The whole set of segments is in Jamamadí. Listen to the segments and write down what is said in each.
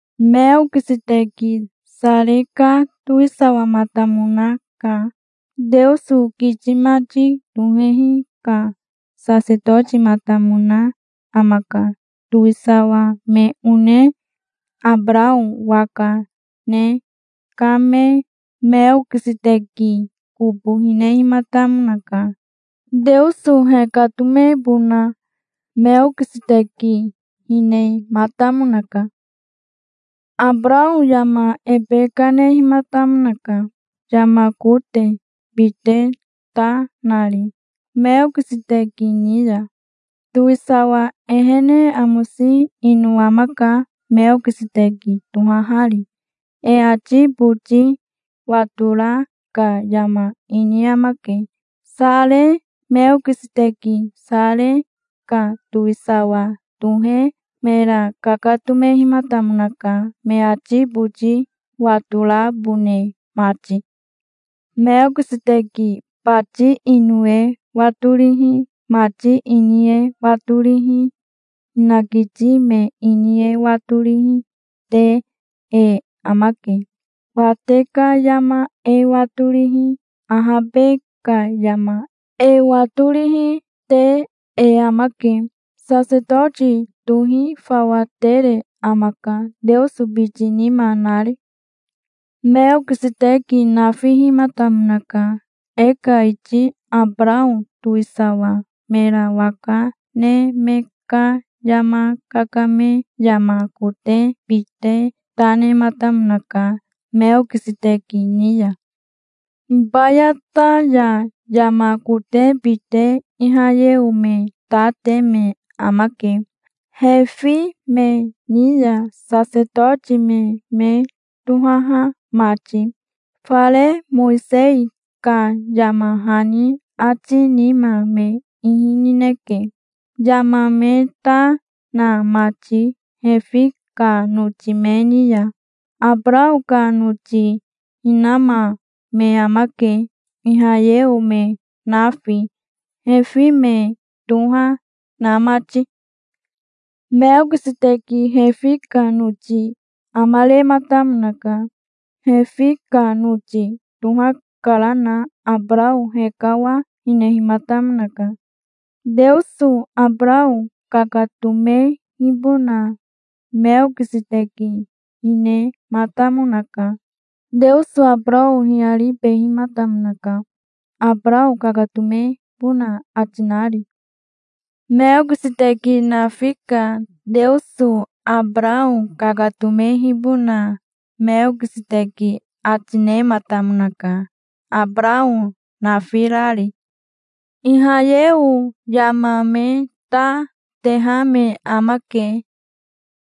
Meokiseteki Sare ka towisawamatamonaka. Teoso kiti mati tohehi ka sasetotimatamona amaka. Towisawa me one Abarao waka ne kame Meokiseteki kobo hinehimatamonaka. Teoso hekatomebona Meokiseteki hinematamonaka. Abarao yama ebe kanehimatamonaka, yama kote bite ta nari Meokiseteki ni ya. Towisawa ehene amose ino amaka, Meokiseteki tohahari. E ati boti watora ka yama ini amake, Sare. Meokiseteki Sare ka towisawa tohe mera kakatomehimatamonaka, me ati boti watorabone mati. Meokiseteki bati ino e watorihi mati ini e watorihi, hinakiti me ini e watorihi, te e amake. Wate ka yama e watorihi, ahabe ka yama e watorihi, te e amake. Sasetoti tohi fawa tere amaka, Teoso biti nima nari. Meokiseteki nafihimatamonaka. E ka iti Abarao towisawa mera waka ne me ka yama kakame yama kote bite ta nematamonaka, Meokiseteki ni ya. Hibayata ya yama kote bite Ihayeo me ta te me amake Refi me ni ya, sasetoti me me tohaha mati. Fare Mowisei ka yama hani ati nima me ihi nineke, yama me ta na mati Refi ka noti me ni ya. Abarao ka noti hinama me amake, Ihayeo me nafi, Refi me toha na mati. Meokiseteki Refi ka noti amarematamonaka. Refi ka noti tohakarana Abarao hekawa hinehimatamonaka. Teoso Abarao kakatomehibona Meokiseteki hinematamonaka. Teoso Abarao hiyaribehimatamonaka, Abarao kakatomebona ati nari. Meokiseteki nafi ka Teoso Abarao kakatomehibona Meokiseteki ati nematamonaka, Abarao nafirari. Ihayeo yama me ta teha me amake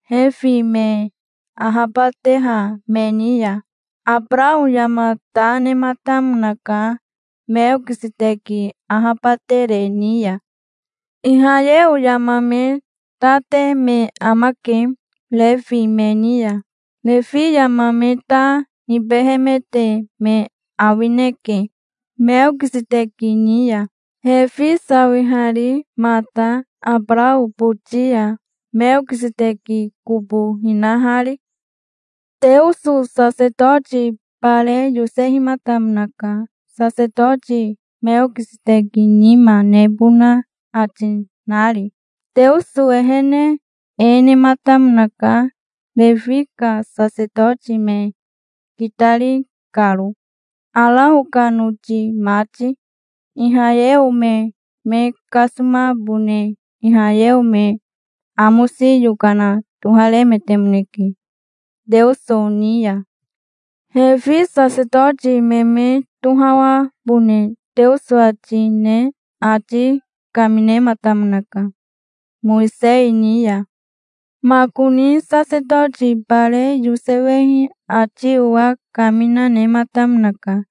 Refi me ahabateha me ni ya. Abarao yama ta nematamonaka, Meokiseteki ahabatere ni ya. Ihayeo yama me ta te me amake Refi me ni ya. Refi yama me ta nibehemete me awineke Meokiseteki ni ya, Refi sawihari mata Abarao boti ya, Meokiseteki kobo hinahari. Teoso sasetoti bare yosehimatamonaka, sasetoti Meokiseteki nima nebona ati nari. Teoso ehene e nematamonaka, Refi ka sasetoti me kitari karo, Arao ka noti mati. Ihayeo me me kasomabone Ihayeo me amosi yokana toharemetemoneke Teoso ni ya. Refi sasetoti me me tohawabone Teoso ati ne ati kaminematamonaka Mowisei ni ya. Makoni sasetoti bare yosewehi ati owa kamina nematamonaka.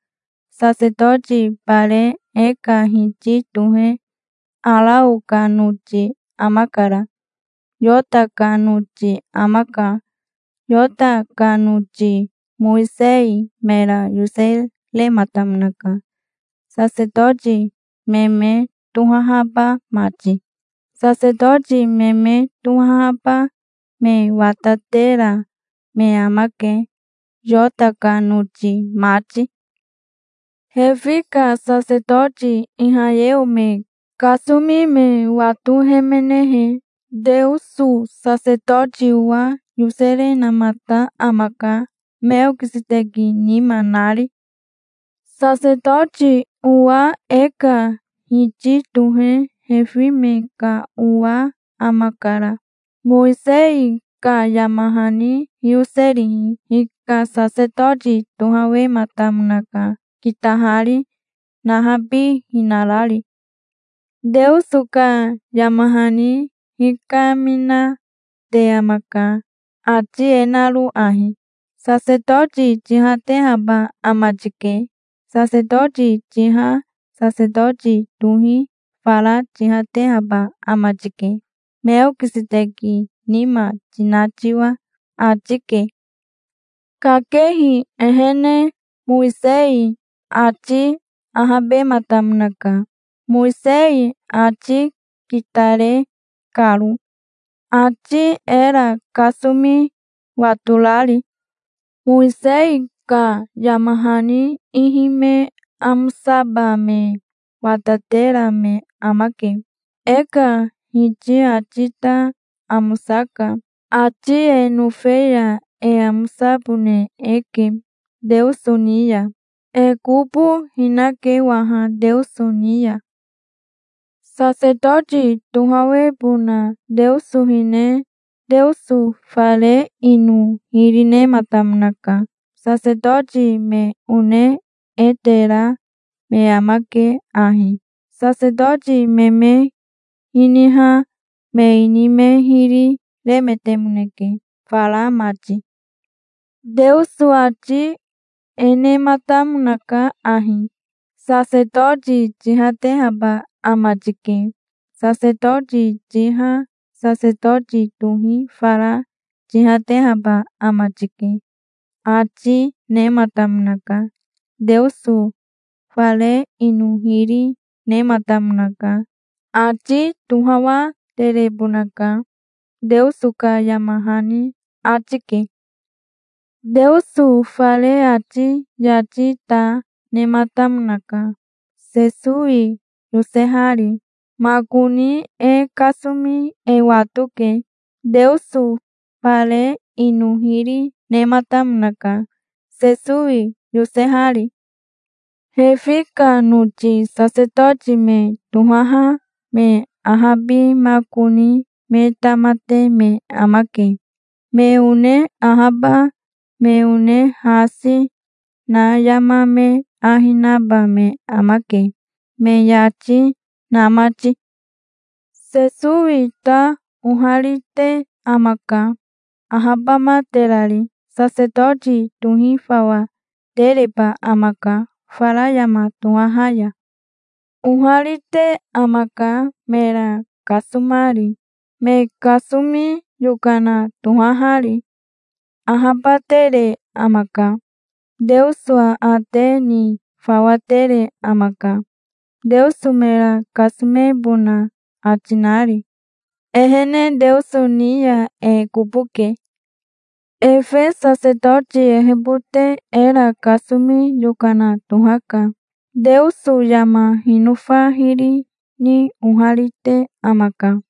Sasetoti bare e ka Hiti tohe Arao ka noti amakara. Yota ka noti amaka. Yota ka noti Mowisei mera yoserematamonaka, sasetoti me me tohahaba mati. Sasetoti me me tohahaba me watatera me amake, Yota ka noti mati. Refi ka sasetoti Ihayeo me kasomi me watohemenehe Teoso sasetoti owa yoserenamata amaka, Meokiseteki nima nari. Sasetoti owa e ka Hiti tohe Refi me ka owa amakara. Mowisei ka yama hani hiyoserihi hika. Sasetoti tohawematamonaka kitahari, nahabihinarari. Teoso ka yama hani hikaminate amaka, ati e naro ahi: "Sasetoti tihatehaba ama tike. Sasetoti tiha sasetoti tohi fara tihatehaba ama tike, Meokiseteki nima tina tiwa", ati ke. Kakehi ehene Mowisei ati ahabematamonaka, Mowisei ati kitare karo, ati era kasomi watorari. Mowisei ka yama hani ihi me amosaba me watatera me amake. E ka Hiti ati ta amosaka. Ati e nofe ya e amosabone eke Teoso ni ya. E kobo hinake waha Teoso ni ya. Sasetoti tohawebona Teoso hine Teoso fare ino hiri nematamonaka. Sasetoti me one e tera me amake ahi. Sasetoti me me hiniha me ini me hiri remetemoneke fara mati. Teoso ati e nematamonaka ahi: "Sasetoti tihatehaba ama tike. Sasetoti tiha sasetoti tohi fara tihatehaba ama tike", ati nematamonaka. Teoso fare ino hiri nematamonaka. Ati tohawaterebonaka, Teoso ka yama hani ati ke. Teoso fare ati yati ta nematamonaka, Sesowi yosehari. Makoni e kasomi e watoke. Teoso fare ino hiri, nematamonaka, Sesowi yosehari. Refi ka noti sasetoti me tohaha me ahabimakoni me tamate me amake. Me one ahaba me one hasi na yama me ahi naba me amake, me yati na mati. Sesowi ta oharite amaka, ahabamaterari. Sasetoti tohi fawa tereba amaka fara yama tohaha ya. Oharite amaka, mera kasomari, me kasomi yokana tohahari. Ahabatere amaka. Teoso aate ni fawa tere amaka, Teoso mera kasomebona ati nari. Ehene Teoso ni ya e kobo ke. Efe sasetoti ehebote era kasomi yokana tohaka. Teoso yama hinofa hiri ni oharite amaka.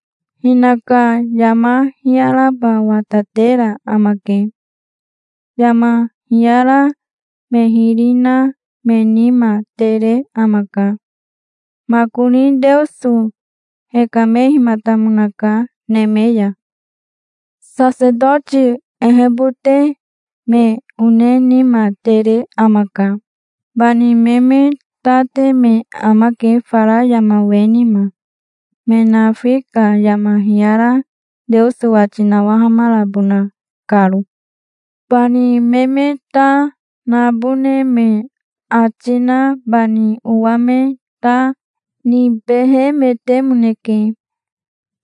Hinaka yama hiyaraba watatera amake. Yama hiyara me hiri na me nima tere amaka. Makoni Teoso hekamehimatamonaka neme ya. Sasetoti ehebote me one nima tere amaka. Bani me me ta te me amake fara yama we nima, me nafi ka yama hiyara Teoso wati nawahamarabona karo. Bani me me ta nabone me ati na bani owa me ta nibehemetemoneke,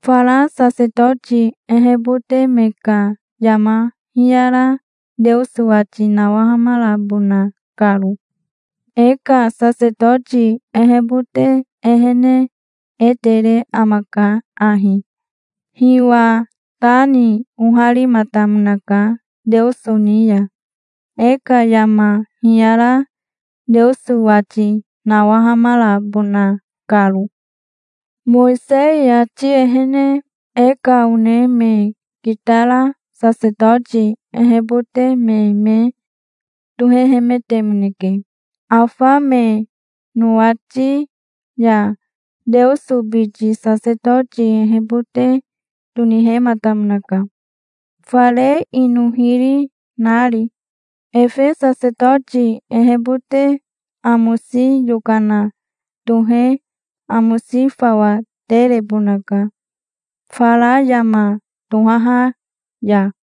fara sasetoti ehebote me ka yama hiyara Teoso wati nawahamarabona karo. E ka sasetoti ehebote ehene e tere amaka ahi. Hiwa ta ni oharimatamonaka Teoso ni ya, e ka yama hiyara Teoso wati nawahamarabona karo. Mowisei ati ehene e ka one me kitara sasetoti ehebote me me tohehemetemoneke. Afa me nowati ya Teoso biti sasetoti ehebote tonihematamonaka, fare ino hiri nari. Efe sasetoti ehebote amosi yokana tohe amosi fawa terebonaka fara yama tohaha ya.